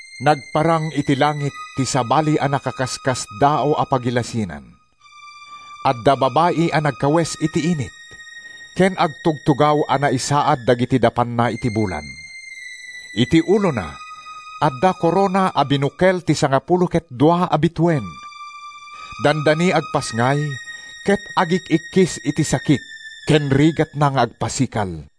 Nagparang iti langit ti sabali a nakaskasdaaw a pagilasinan. Adda babai a nagkawes iti init, ken agtugtugaw a naisaad dagiti dapanna iti bulan: iti ulona adda korona a binukel ti sangapulo ket dua a bituen. Dandani agpasngay ket agik-ikkis iti sakit ken rigatna nga agpasikal.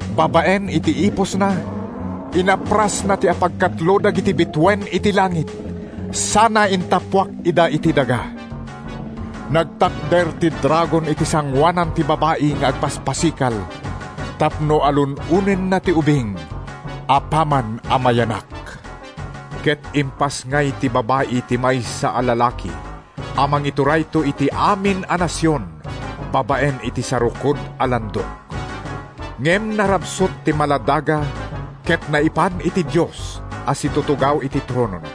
Babaen iti ipusna, inaprasna ti apagkatlo dagiti bituen iti langit sana intappuak ida iti daga. Nagtakder ti dragon iti sangoanan ti babai nga agpaspasikal tapno alun-onenna ti ubing apaman a mayanak. Ket impasngay ti babai ti maysa a lalaki a mangiturayto iti amin a nasion babaen iti sarukod a landok. Ngem narabsut ti maladaga ket naipan iti Dios a situtugaw iti tronona.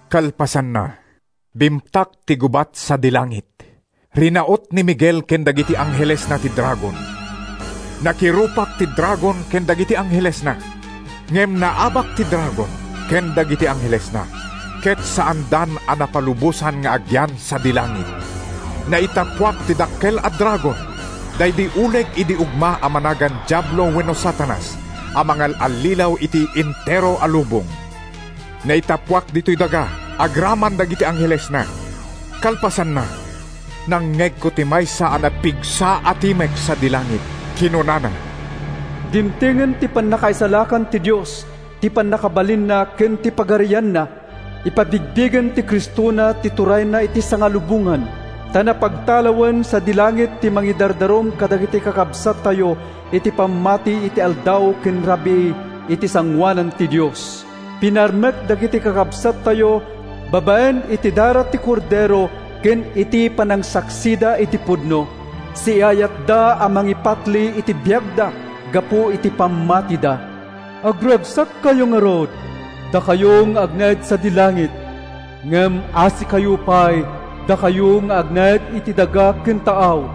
Kalpasanna, bimtak ti gubat sadi langit. Rinaut ni Miguel ken dagiti anghelesna ti dragon. Nakirupak ti dragon ken dagiti anghelesna. Ngem naabak ti dragon ken dagiti anghelesna, ket saandan a napalubosan nga agyan sadi langit. Naitappuak ti dakkel a dragon, daydi uleg idi ugma a managan Diablo wenno Satanas, a mangal-allilaw iti entero a lubong. Naitappuak ditoy daga agraman dagiti anghelesna. Kalpasanna, nangngegko ti maysa a napigsa a timek sadi langit. Kinunana, “Dimtengen ti panangisalakan ti Dios, ti pannakabalinna ken ti pagarianna! Ipabigbigen ti Cristona ti turayna iti sangalubongan. Ta napagtalawen sadi langit ti mangidardarum kadagiti kakabsattayo iti pammati iti aldaw ken rabii iti sangoanan ti Dios. Pinarmek dagiti kakabsattayo babaen iti dara ti Kordero ken iti panangsaksida iti pudno. Siaayatda a mangipatli iti biagda gapu iti pammatida. Agragsakkayo ngarud, dakayo nga agnaed sadi langit. Ngem asikayo pay, dakayo nga agnaed iti daga ken taaw!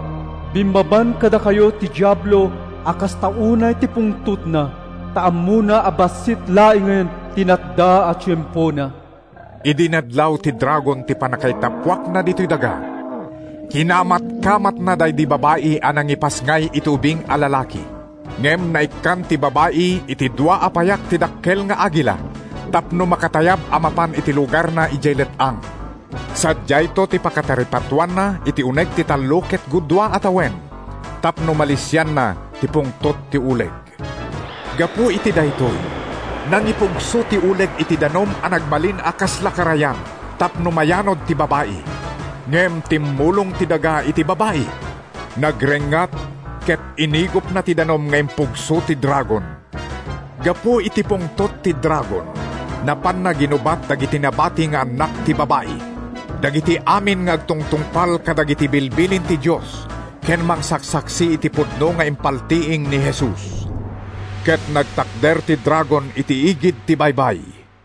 Bimmaban kadakayo ti Diablo a kasta unay ti pungtotna, ta ammona a bassit laengen ti natda a tiempona.” Idi nadlaw ti dragon ti pannakaitappuakna ditoy daga, kinamatkamatna daydi babai a nangipasngay iti ubing a lalaki. Ngem naikkan ti babai iti dua a payak ti dakkel nga agila tapno makatayab a mapan iti lugarna idiay let-ang. Sadiayto ti pakataripatoanna iti uneg ti tallo ket gudua a tawen tapno malisianna ti pungtot ti uleg. Gapu iti daytoy, nangipugso ti uleg iti danum a nagbalin a kasla karayan tapno mayanud ti babai. Ngem timmulong ti daga iti babai. Nagrengngat ket inigupna ti danum nga impugso ti dragon. Gapu iti pungtot ti dragon, napanna ginubat dagiti nabati nga annak ti babai, dagiti amin nga agtungtungpal kadagiti bilbilin ti Dios ken mangsaksaksi iti pudno nga impaltiing ni Jesus. Ket nagtakder ti dragon iti igid ti baybay.